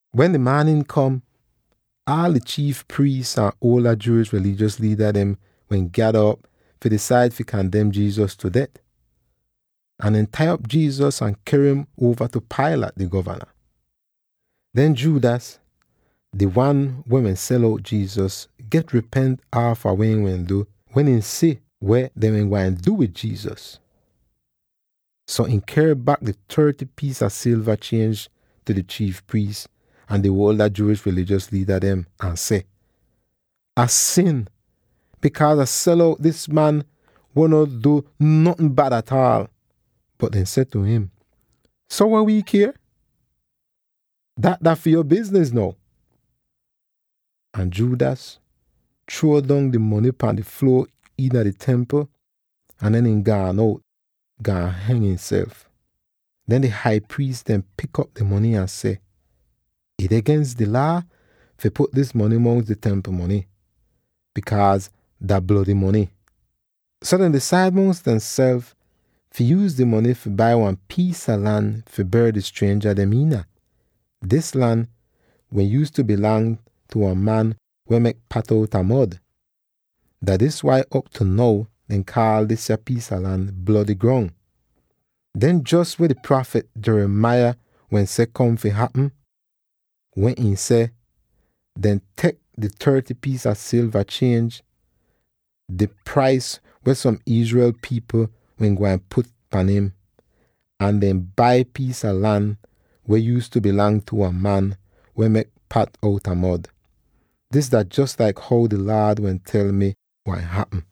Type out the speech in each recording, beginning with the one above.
Wen di maanin kom, aal di chiif priis ahn di ada Jewish rilijos liida dem wehn gyada op fi disaid fi kandem Jesus tu det. Ahn dehn tai op Jesus ahn ker im uova tu Pilate, di govana. Den Judas, di wan weh wehn sel out Jesus, get ripent aafa weh ihn wehn du wen ihn si weh dehn gwain du wid Jesus. So ihn ker bak di thirty piis a silva chienj tu di chiif priis ahn di ada Jewish rilijos liida dem, ahn seh, “Ah sin bikaaz Ah sel out dis man weh no du notn bad ataal.” Bot dehn seh tu im, “So weh wii kier? Dat dah fi yo bizniz now!” Ahn Judas chruo don di mony pahn di fluo iina di Templ, ahn den ihn gaan out, gaan heng ihnself. Den di hai priis dehn pik op di mony ahn seh, “Ih deh gens di Laa fi put dis mony mongs di Templ mony, bikaaz dah blody mony.” So dehn disaid mongs demself fi yuuz di mony fi bai wan piis a lan fi ber di strienja dem iina; dis lan wehn yuuztu bilang tu wan man weh mek pat outa mod. Dah dis wai, op tu now dehn kaal disya piis a lan “Blody Grong.” Den jos weh di prafit Jeremiah wehn seh kom fi hapm, wen ihn seh, “Dehn tek di thirty piis a silva chienj, di prais weh som Israel pipl wehn gwain put pahn im, ahn dehn bai piis a lan weh yuuztu bilang tu wan man weh mek pat outa mod. Dis dah jos laik how di Laad wehn tel mi gwain hapm.”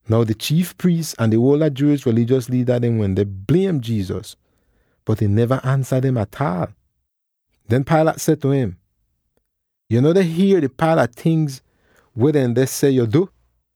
Now di chiif priis ahn di ada Jewish rilijos liida dem wende bliem Jesus, bot ihn neva ansa dem ataal. Den Pilate seh tu im, “Yo no deh hier di paila tingz weh dehn deh seh yo du?”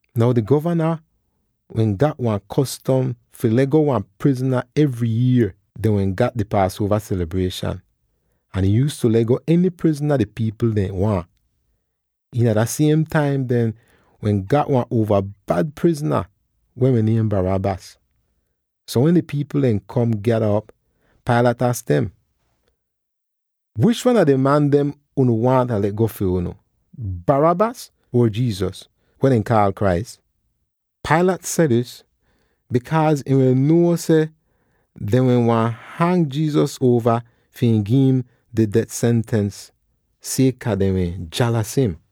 Now di govana wehn gat wan kostom fi le'go wan prizna evry yier dehn wehn gat di Paasuova selibrieshan, ahn ihn yuuztu le'go eny prizna di pipl dehn waahn. Iina dah siem taim dehn wehn gat wan uova bad prizna weh wehn niem Barabbas. So, wen di pipl dem don gyada op, Pilate aks dem, “Wish wan a di man dem unu waahn Ah le'go fi unu, Barabbas, or Jesus, weh dehn kaal Christ?” Pilate seh dis bikaaz ihn wehn nuo seh dehn wehn han Jesus uova fi ihn gi'im di det sentens sieka dehn wehn jalas afta him.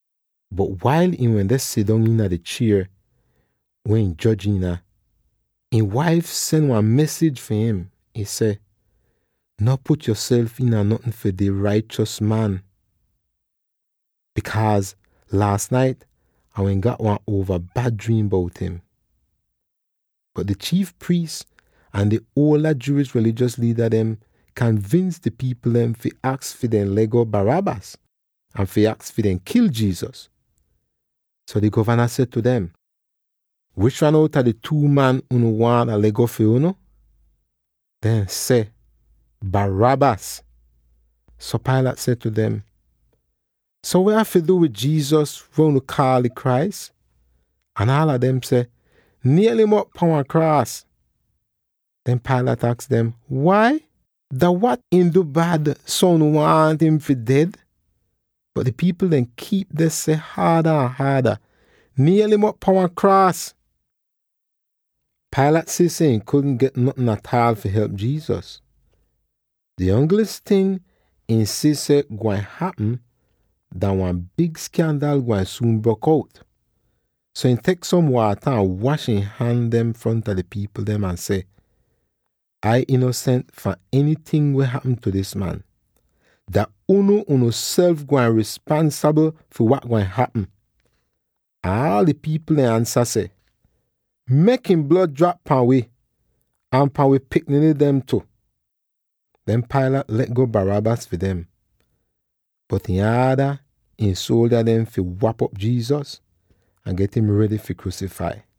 Bot wail ihn wende sidong iina di chier weh ihn joj iina, ihn waif sen wan mesij fi im. Ihn seh, “No put yoself iina notn fi dah raichos man, bikaaz laas nait Ah wehn gat wan uova bad driim bout im.” Bot di chiif priis ahn di ada Jewish rilijos liida dem kanvins di pipl dem fi aks fi ihn le'go Barabbas, ahn fi aks fi dehn kil Jesus. So di govana seh tu dem, “Wish wan outa di two man unu waahn Ah le'go fi unu?” Dehn seh, “Barabbas!” So Pilate seh tu dem, “So weh Ah fi du wid Jesus, weh unu kaal di Christ?” Ahn aala dem seh, “Niel'im op pan wan kraas!” Den Pilate aks dem, “Wai? Dah wat ihn du bad, so unu waahn im fi ded?” Bot di pipl dem kiip deh seh haada ahn haada, “Niel'im op pan wan kraas!” Pilate si seh ihn kudn get notn ataal fi help Jesus; di ongl ting ihn si seh gwain hapm, dah wan big skaandal gwain suun brok out. So ihn tek som waata ahn wash ihn han dem fronta di pipl dem, ahn seh, “Ai inosent fahn enyting weh hapm tu dis man. Dah unu unuself gwain rispansabl fi wat gwain hapm.” Ahn aal di pipl dem ansa seh, “Mek ihn blod drap pahn wi ahn pahn wi pikniny dem tu!” Den Pilate le'go Barabbas fi dem, bot ihn aada ihn suoldya dem fi wap'op Jesus, ahn get im redy fi kruusifai.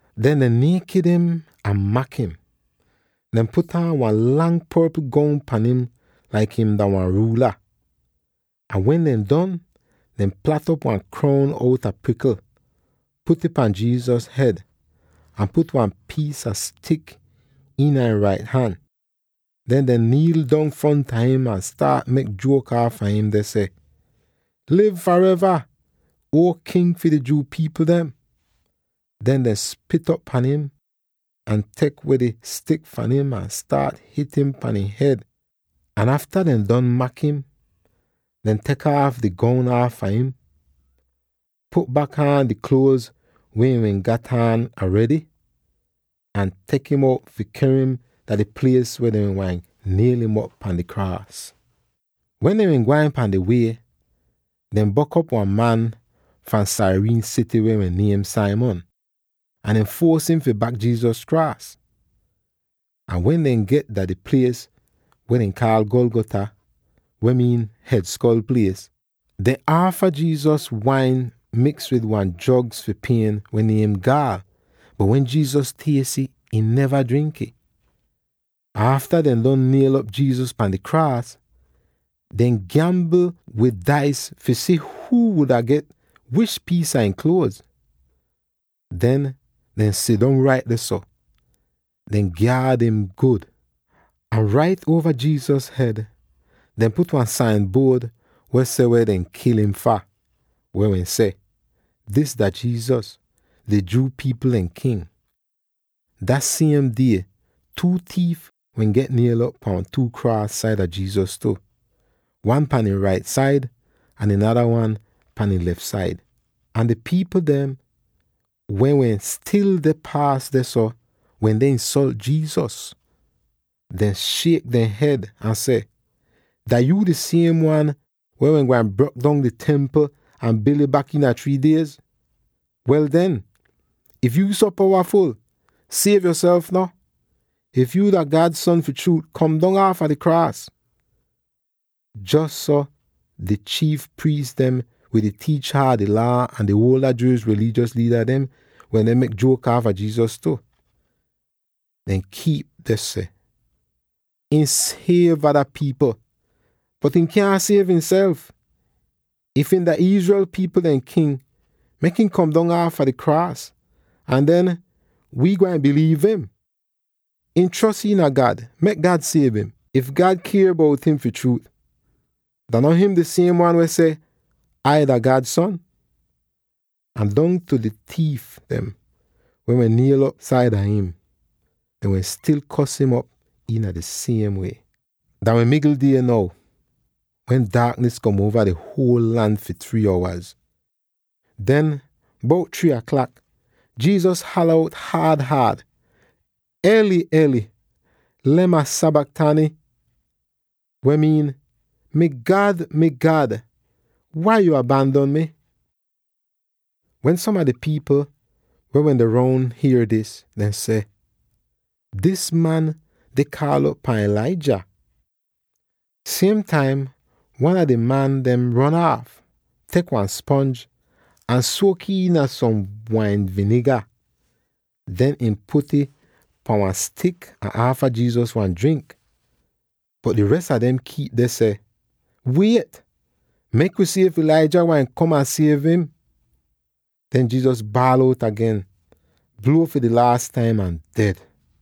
Den dehn niekit im ahn mak im: dehn put aan wan lang porpl goun pan im laik him dah wan ruula. Ahn wen dehn don, dehn plat'op wan kroun outa prikl, put'ih pan Jesus hed, ahn put wan piis a stik iina ihn rait han. Den dehn niil dong fronta im ahn staat mek juok aafa im; deh seh, “Liv fareva, Uo King fi di Jew pipl dem!” Den dehn spit op pahn im, ahn tek weh di stik fahn im, ahn staat hit'im pahn ihn hed. Ahn afta dehn don mak im, dehn tek aaf di goun aafa im, put bak aan di kluoz weh ihn wehn gat aan aredy, ahn tek im out fi ker im dah di plies weh dehn wehn gwain niel'im op pan di kraas. Wen dehn wehn gwain pahn di wie, dehn bok'op wan man fahn Cyrene sity weh wehn niem Simon, ahn dehn fuos im fi bak Jesus kraas. Ahn wen dehn get dah di plies weh dehn kaal Golgotha, weh miin “Hed Skol Plies,” dehn aafa Jesus wain miks wid wan drogz fi pien weh niem “gaal,” bot wen Jesus ties ih, ihn neva drink'ih. Ahn afta dehn don niel'op Jesus pahn di kraas, dehn gyambl wid dais fi si huu wuda get wish piis a ihn kluoz. Den dehn sidong rait dehso, deh gyaad im gud. Ahn rait uova Jesus hed dehn put wan sain buod weh seh weh dehn kil im fah, weh wehn seh: “Dis dah Jesus, di Jew pipl dehn King.” Dah siem die two tiif wehn get niel'op pahn two kraas saida Jesus tu; wan pahn ihn rait said ahn di nada wan pahn ihn lef said. Ahn di pipl dem weh wehn stil deh paas dehso wende insolt Jesus, deh shiek dehn hed, ahn seh, “Dah yuu di siem man weh wehn gwain brok dong di Templ ahn bil'ih bak iina three diez? Wel den, if yuu so powaful, siev yoself no! If yuu dah God Son fi chruut, kom dong aafa di kraas!” Jos so di chiif priis dem wid di tiicha a di Laa ahn di ada Jewish rilijos liida dem wende mek juok aafa Jesus tu. Dehn kiip deh seh, “Ihn siev ada pipl, bot ihn kyaahn siev ihnself! If ihn dah Israel pipl dehn king, mek ihn kom dong aafa di kraas, ahn den wii gwain biliiv im! Ihn chros iina God; mek God siev im, if God kier bout im fi chruut. Dah no him di siem wan weh seh, ‘Ai dah God Son.’” Ahn dongtu di tiif dem weh wehn niel'op saida im, dehn wehn stil kos im op iina di siem wie. Dah wehn migl die now, wen daaknis kom uova di huol lan fi three owaz. Den, bout three aklak Jesus hala out haad-haad, “Eloi, Eloi, lema sabachthani?” weh miin, “Mi God, Mi God, wai yo abandon mi?” Wen som a di pipl weh wende roun hier dis, dehn seh, “Dis man deh kaal'op pahn Elijah!” Siem taim wan a di man dem ron aaf, tek wan sponj, ahn suok'ih iina som wain viniga. Den ihn put'ih pahn wan stik ahn aafa Jesus wan drink. Bot di res a dem kiip deh seh, “Wiet! Mek wi si if Elijah gwain kom ahn siev im!” Den Jesus baal out agen, bluo fi di laas taim ahn ded.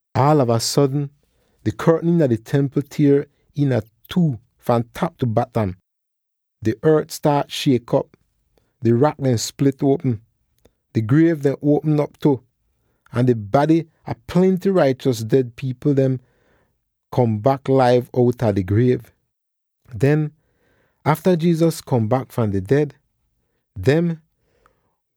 Aalava sodn di kortn iina di Templ tier iina two fahn tap tu batam, di ort staat shiek op, di rak dem split uopm, di griev dem uopm op tu, ahn di bady a plenty raichos ded pipl dehn kom bak laiv outa dehn griev! Den, afta Jesus kom bak fram di ded, dem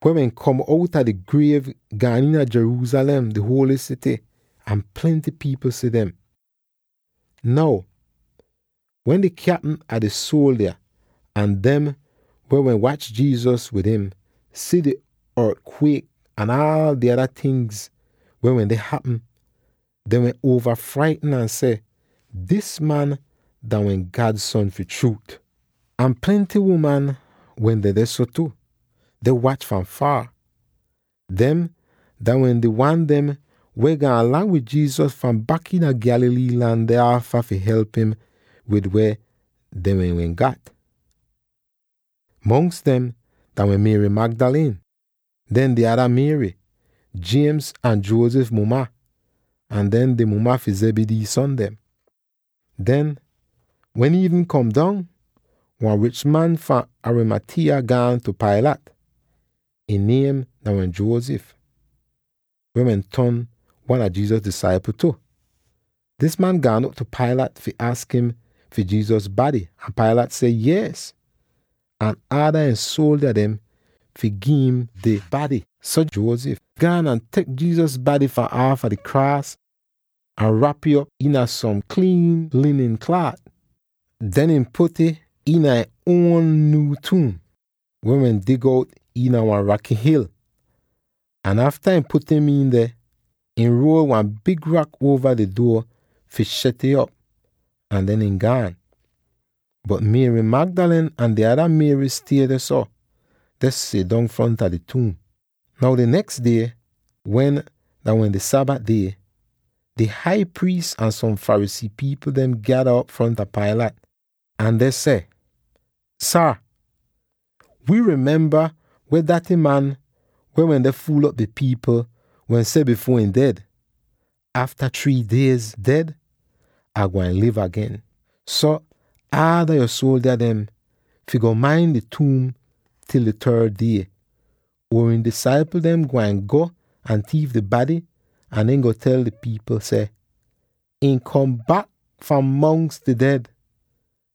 weh wehn kom outa di griev gaan iina Jerusalem, di huoly sity, ahn plenty pipl si dem! Now, wen di kyapm a di suoldya ahn dem weh wehn wach Jesus wid im si di ort-kwiek ahn aal di ada tingz weh wende hapm, dehn wehn get uova fraitn ahn seh, “Dis man dah wehn God Son fi chruut!” Ahn plenty uman wende dehso tu, deh wach fahn foor. Dem dah wehn di wan dem weh gaan lang wid Jesus fahn bak iina Galilee lan deh aafa fi help im wid weh dehn wehn gat. Mongs dem dah wehn Mary Magdalene, den di ada Mary —James ahn Joseph muma— ahn den di muma fi Zebedee son dem. Den, wen iivnin kom dong, wan rich man fahn Arimathea gaan tu Pilate. Ihn niem dah wehn Joseph, weh wehn ton wan a Jesus disaipl tu. Dis man gaan op tu Pilate fi aks im fi Jesus bady, ahn Pilate seh, yees, ahn ada ihn suoldya dem fi gi'im di bady. So, Joseph gaan ahn tek Jesus bady fahn aafa di kraas ahn rap'ih op iina som kliin linin klaat. Dehn ihn put'ih iina ihn uon nyuu tuum, weh wehn dig out iina wan raky hil. Ahn afta ihn put im iin deh, ihn ruol wan big rak uova di duo fi shet'ih op, ahn den ihn gaan. Bot Mary Magdalene ahn di ada Mary stie dehso, deh sidong fronta di tuum. Now di neks die, weh dah wehn di Sabat die, di hai priis ahn som Pharisee pipl dehn gyada op fronta Pilate, ahn dehn seh, “Saar, wii memba weh daty man —weh wende fuul'op di pipl— wehn seh bifuor ihn ded, ‘Afta three diez ded, Ah gwain liv agen.’ So, aada yo suoldya dem fi go main di tuum til di third die, or ihn disaipl dem gwain go ahn tiif di bady ahn den go tel pipl seh, ‘Ihn kom bak fahn mongs di ded.’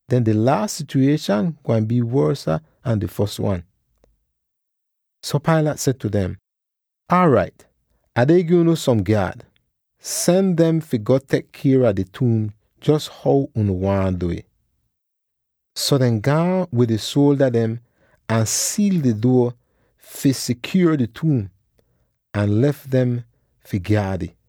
Den di laas sityuwieshan gwain bii wosa an di fos wan!” So Pilate seh tu dem, “Aarait, Ah deh gi unu som gyaad. Sen dem fi go tek kier a di tuum jos how unu waahn du'ih.” So dehn gaan wid di suoldya dem ahn siil di duo fi sikyuor di tuum, ahn lef dem fi gyaad ih.